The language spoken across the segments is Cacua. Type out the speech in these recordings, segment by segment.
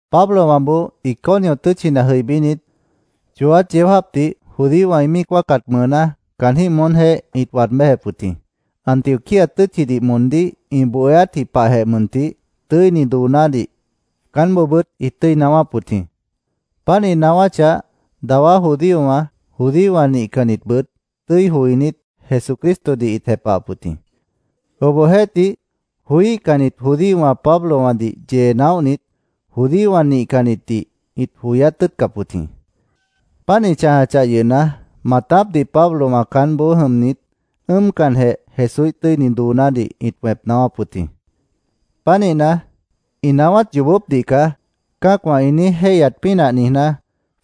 Pablowãboó Iconio tʉ́tchina jʉibínit, chooát yeó jáapdih judíowã ĩ míic wáacat mʉʉná caanjĩ́h moónjeéh ĩt waad béjep wʉt jĩ. Antioquía tʉ́tchidih moondíh ĩ bohéátji pahjeh mʉntih tʉ́ini doonádih caánboobʉ́t ĩt tʉ́i naáwáp wʉt jĩ. Páant ĩ naáwáchah, dawá judíowã, judíowã nihcannitbʉt tʉ́i joinít, Jesucristodih ĩt jepahap wʉt jĩ. Obohjeéhtih, joííhcannit judíowã Pablowãdih yee naóhnit, judíowã nihcannitdih ĩt joyát tʉ́ʉtcap wʉt jĩ. Páant ĩ chãjachah yʉhna, maatápdih Pablowã caánboó jʉmnit, ʉ́ʉmcanjeh Jesúíh tʉ́ini doonádih ĩt wẽp naáwáp wʉt jĩ. Pánihna, “Ĩ naáwát yoobópdih caá”, cã́acwã ĩ niíj jéihyat pínah niijná,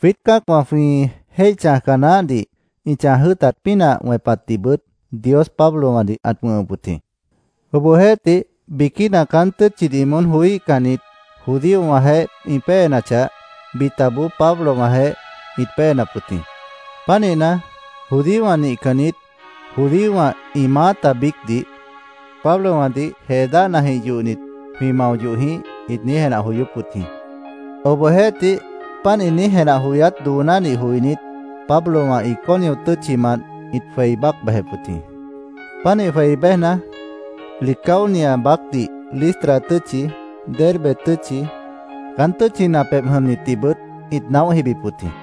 jwiít cã́acwã jwĩ jéih chãjca naáhdih ĩ chãj jʉ́ʉtat pínah wẽpatdihbʉt Dios Pablowãdih ãt wʉ̃hʉp wʉt jĩ. Obohjeéhtih, biquína caán tʉ́tchidih moón joííhcannit judíowãjeéh ĩ péenachah, bitaboó Pablowãjeéh ĩt péenap wʉt jĩ. Pánihna, judíowã nihcannit, judíowã, ĩ maáta biícdih, “Pablowãdih jee dáhnajĩh yohnit, jwĩ mao yoh jĩíh”, ĩt niíj jenah joyóp wʉt jĩ. Obohjeéhtih, páant ĩ niíj jenah joyát doonádih joinít, Pablowã Iconio tʉ́tchimant ĩt jwei bác bejep wʉt jĩ. Pánih jwei béjna, Licaonia baácdih Listra tʉ́tchi, Derbe tʉ́tchi, caán tʉ́tchina pebh jʉmnitdihbʉt ĩt naóh jibip wʉt jĩ.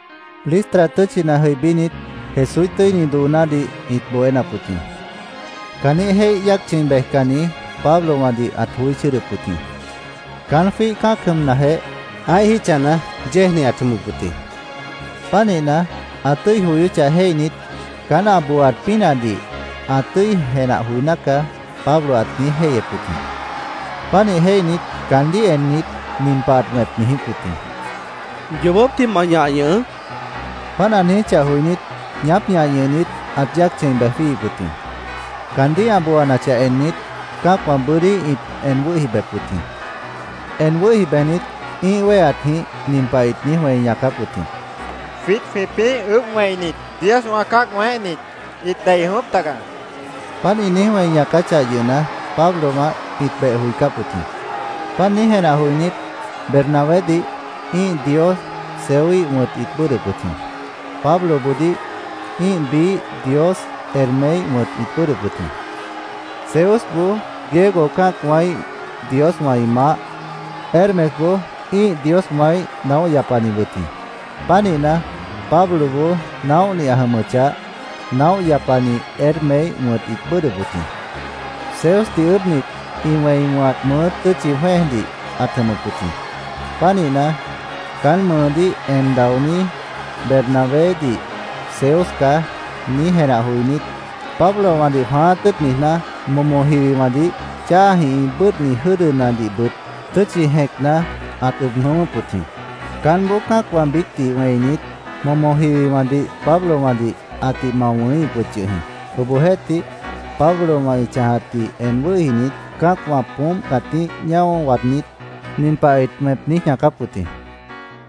Listra tʉ́tchina jʉibínit, Jesúíh tʉ́ini doonádih ĩt bohénap wʉt jĩ. Caanjĩ́h jéih yáac chʉ̃i bejcanni Pablowãdih ãt joí chʉ́ʉdʉp wʉt jĩ. Caán jwíih cã́ac jʉmnajeh, ã́ih jítchana yéejni ãt jʉmʉp wʉt jĩ. Pánihna, ã tʉ́i joyóchah jéihnit, “Caán ã booat pínahdih ã tʉ́i jenah joiná caá”, Pablo ãt niíj jéihyep wʉt jĩ. Pánih jéihnit, caandíh ennit, nin pah ãt wẽp niijíp wʉt jĩ: —Yoobópdih ma ñah ñʉhʉʉ́, ãt niijíp wʉt jĩ. Páant ã niijíchah joinít, ñaáp ñah ñʉhnit, ãt yáac chʉ̃i bej jwíihip wʉt jĩ. Caandíh ã booanachah ennit, cã́acwã bʉ́dí ĩt en wʉ́hi bejep wʉt jĩ. En wʉ́hi bejnit, ĩ́ih wéheatjĩh nin pah ĩt niíj wẽi ñaacáp wʉt jĩ: —Jwiít jwĩpĩ́ ʉʉ́bh wẽinit dioswã cã́ac wẽéhnit, ĩt dei jʉ̃ʉ́wʉ́p taga, ĩt niijíp wʉt jĩ. Páant ĩ niíj wẽi ñaacáchah yʉhna, Pablowã ĩt beh joicáp wʉt jĩ. Páant niíj jenah joinít, Bernabédih ĩ́ih dios Zeuíh wʉ̃t ĩt bʉ́ʉdhdʉp wʉt jĩ. Pabloboodíh ĩ́ih biíh dios Hermeíh wʉ̃t ĩt bʉ́ʉdhdʉp wʉt jĩ. Zeusboó Griego cã́acwãíh dioswã ĩ maáh, Hermesboó ĩ́ih dioswãíh naóh yapani wʉt jĩ. Pánihna, Pabloboó naóhni ã jʉmʉchah, naóh yapani Hermeíh wʉ̃t ĩt bʉ́ʉdhdʉp wʉt jĩ. Zeusdih ʉʉ́bhnit, ĩ wẽi wʉ̃hat mʉʉ́ tʉ́tchi jwẽ́ejdih ãt jʉmʉp wʉt jĩ. Pánihna, caán mʉʉdíh en daoní Bernabédih “Zeus caá”, niíj jenah joinít, Pablowãdih jwãáát tʉ́ʉt niijná, momo jiwiwãdih cháajĩh ĩ bʉ́ʉdhni jʉ́dʉnadihbʉt tʉ́tchi jẽcna ãt ʉb jʉ̃ʉ́wʉ́p wʉt jĩ. Caánboó cã́acwã biícdih wẽinit, momo jiwiwãdih Pablowãdih ãtih mao wʉ̃híhip wʉt yʉh jĩ. Obohjeéhtih, Pablowã ĩ chãjatdih en wʉ́hinit, cã́acwã poómp cãtíh ñáo waadnít, nin pah ĩt wẽp niíj ñaacáp wʉt jĩ: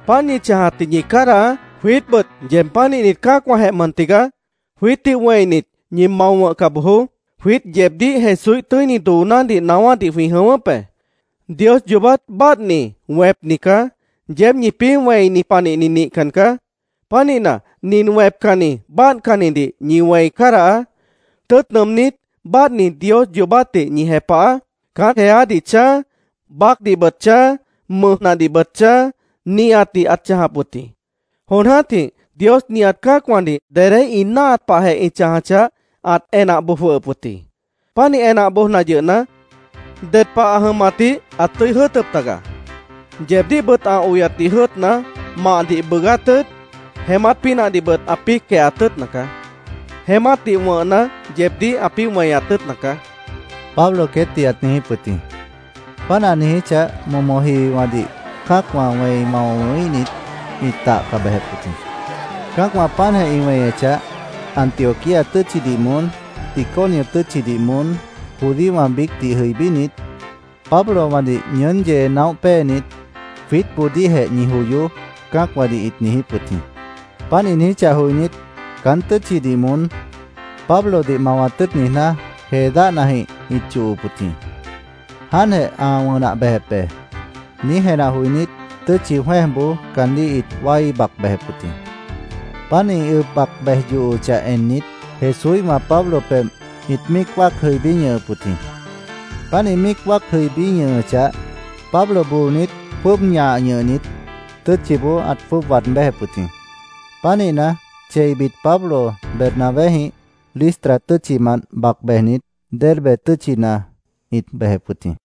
—Páant ñi chãjatdih ñi cádahaá. Jwiítbʉt yeeb pánihnit cã́acwãjeh mʉn tigaá. Jwiítdih wẽinit, ñi mao wʉ̃hca bojoó. Jwiít yeebdíh Jesúíh tʉ́ini doonádih naáwádih jwĩ jʉ̃ʉ́wʉ́p be. Dios yoobát báadhni, wẽpni caá. Yeéb ñipĩ́ wẽini panihni nihcan caá. Pánihna, nin wẽpcanni, báadhcannidih ñi wẽi cádahaá. Tʉ́ʉt nʉʉmnít, báadhni Dios yoobátdih ñi jepahaá. Caán jeádih chãj, baácdihbʉt chãj, mʉjnadihbʉt chãj, nihatdih ãt chãjap wʉt jĩ. Jon jã́tih Dios nihat cã́acwãdih dedé ĩ náahat pahjeh ĩ chãjachah, ãt enah boj jwʉhʉp wʉt jĩ. Pánih enah bojna yʉhna, ded pah ã jʉmatdih ãt tʉ́i jʉ́ʉtʉp taga. Yeebdíhbʉt ã oyatdih jʉ́ʉtna, mahdih bʉʉgát tʉ́ʉt, jeémát pínahdihbʉt ãpĩ́ quehat tʉ́ʉtna caá. Jeémátdih wʉ̃hna, yeebdíh ãpĩ́ weñat tʉ́ʉtna caá, Pablo queétdih ãt niijíp wʉt jĩ. Páant ã niijíchah, momo jiwiwãdih cã́acwã wẽi mao wʉ̃híhnit, ĩt tahca bejep wʉt jĩ. Cã́acwã páantjeh ĩ weñechah, Antioquía tʉ́tchidih moón, Iconio tʉ́tchidih moón judíowã biícdih jʉibínit, Pablowãdih ñʉʉ́n yee naóh péenit, “Jwiítboodíhjeh ñi joyoó”, cã́acwãdih ĩt niijíp wʉt jĩ. Páant ĩ niijíchah joinít, caán tʉ́tchidih moón Pablodih mawat tʉ́ʉt niijná, jee dáhnajĩh ĩt yohop wʉt jĩ. “Jáantjeh ã wʉnah bejep be”, niíj jenah joinít, tʉ́tchi jwẽ́ejboó caandíh ĩt wái bac bejep wʉt jĩ. Páant ĩ ʉb bac bej yohochah ennit, Jesúíhwã Pablo pebh ĩt míic wáac jʉibí ñʉhʉp wʉt jĩ. Páant ĩ míic wáac jʉibí ñʉhʉchah, Pablo boonit, jwʉ́ʉb ñah ñʉhnit, tʉ́tchiboó ãt jwʉ́ʉb waad béjep wʉt jĩ. Pánihna, cheibit Pablo Bernabéjĩh Listra tʉ́tchimant bac bejnit, Derbe tʉ́tchina ĩt bejep wʉt jĩ.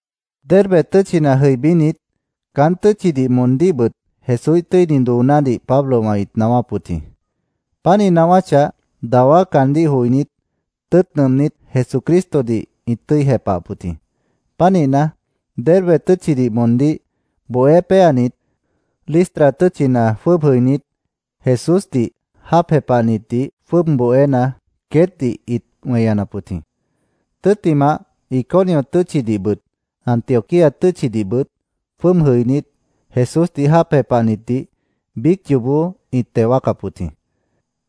Derbe tʉ́tchina jʉibínit, caán tʉ́tchidih moondíhbʉt Jesúíh tʉ́ini doonádih Pablowã ĩt naáwáp wʉt jĩ. Páant ĩ naáwáchah, dawá caandíh joinít, tʉ́ʉt nʉʉmnít, Jesucristodih ĩt tʉ́i jepahap wʉt jĩ. Pánihna, Derbe tʉ́tchidih moondíh bohé péanit, Listra tʉ́tchina jwʉ́ʉb jʉinít, Jesúsdih jáap jepahnitdih jwʉ́ʉb bohéna, queétdih ĩt weñanap wʉt jĩ. Tʉ́ttimah, Iconio tʉ́tchidihbʉt, Antioquía tʉ́tchidihbʉt jwʉ́ʉb jʉinít, Jesúsdih jáap jepahnitdih biíc yoobó ĩt teo wáacap wʉt jĩ.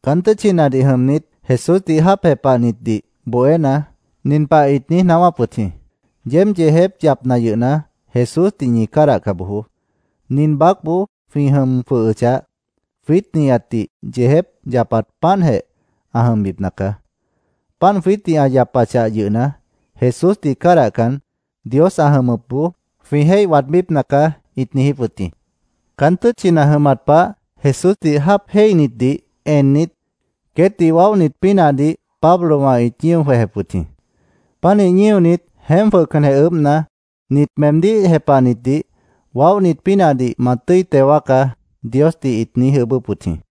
Caán tʉ́tchinadih jʉmnit, Jesúsdih jáap jepahnitdih bohéna, nin pah ĩt niíj naáwáp wʉt jĩ: “Yeéb yeejép yapna yʉhna, Jesúsdih ñi cádahca bojoó. Nin baácboó jwĩ jʉm jwʉhʉchah, jwiít nihatdih yeejép yapat páantjeh ã jʉmbipna caá. Páant jwiítdih ã yapachah yʉhna, Jesúsdih cádahcan, Dios ã jʉmʉpboó jwĩ jéih waadbípna caá”, ĩt niijíp wʉt jĩ. Caán tʉ́tchina jʉmat pah Jesúsdih jáap jéihnitdih ennit, queétdih waóhnit pínahdih Pablowã ĩt ñío jwejep wʉt jĩ. Pánih ñíonit, jeémp jwʉhcanjeh ʉʉ́bhna, “Nit meemdíh jepahnitdih waóhnit pínahdih ma tʉ́i teo wáacá”, Diosdih ĩt niíj ʉʉ́bʉ́p wʉt jĩ.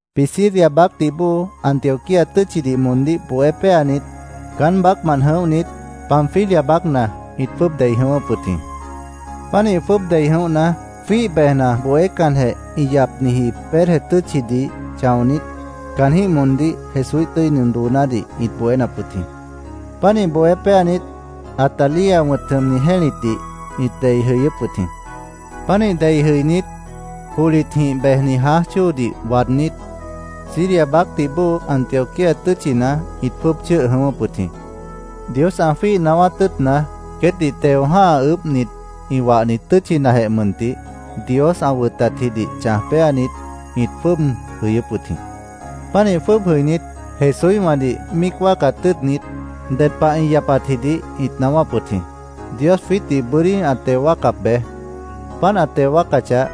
Pisidia baácdih bóo Antioquía tʉ́tchidih moondíh bohé péanit, caán baácmant jʉ̃óhnit, Panfilia baácna ĩt jwʉ́ʉb dei jʉ̃ʉ́wʉ́p wʉt jĩ. Pánih jwʉ́ʉb dei jʉ̃óhna, jwíih bejna, bohécanjeh ĩ yapniji Perge tʉ́tchidih chãonít, caanjĩ́h moondíh Jesúíh tʉ́ini doonádih ĩt bohénap wʉt jĩ. Pánih bohé péanit, Atalia wʉ̃t jʉmni jẽ́litdih ĩt dei jʉyʉ́p wʉt jĩ. Pánih dei jʉinít, johlitjĩh bejni jãáj chóodih waadnít, Siria baácdih bóo Antioquía tʉ́tchina ĩt jwʉ́ʉb chʉ́ʉh jʉ̃ʉ́wʉ́p wʉt jĩ. Dios ã jwíih naáwát tʉ́ʉtna, queétdih teo jã́ha ʉʉ́bhnit ĩ wahni tʉ́tchinajeh mʉntih, Dios ã wʉtatjidih chãj péanit, ĩt jwʉ́ʉb jʉyʉ́p wʉt jĩ. Pánih jwʉ́ʉb jʉinít, Jesúíhwãdih míic wáacat tʉ́ʉtnit, ded pah ĩ yapatjidih ĩt naáwáp wʉt jĩ: “Dios jwiítdih bʉ́dí ã teo wáacap be. Páant ã teo wáacachah,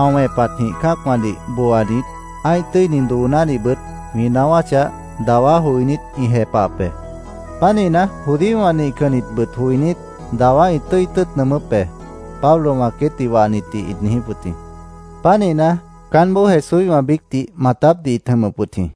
ã wẽpatjĩh cã́acwãdih booanit, ã́ih tʉ́ini doonádihbʉt jwĩ naáwáchah, dawá joinít, ĩ jepahap be. Pánihna, judíowã nihcannitbʉt joinít, dawá ĩ tʉ́i tʉ́ʉt nʉʉmʉ́p be”, Pablowã queétdih wahnitdih ĩt niijíp wʉt jĩ. Pánihna, caánboó Jesúíhwã biícdih maatápdih ĩt jʉmʉp wʉt jĩ.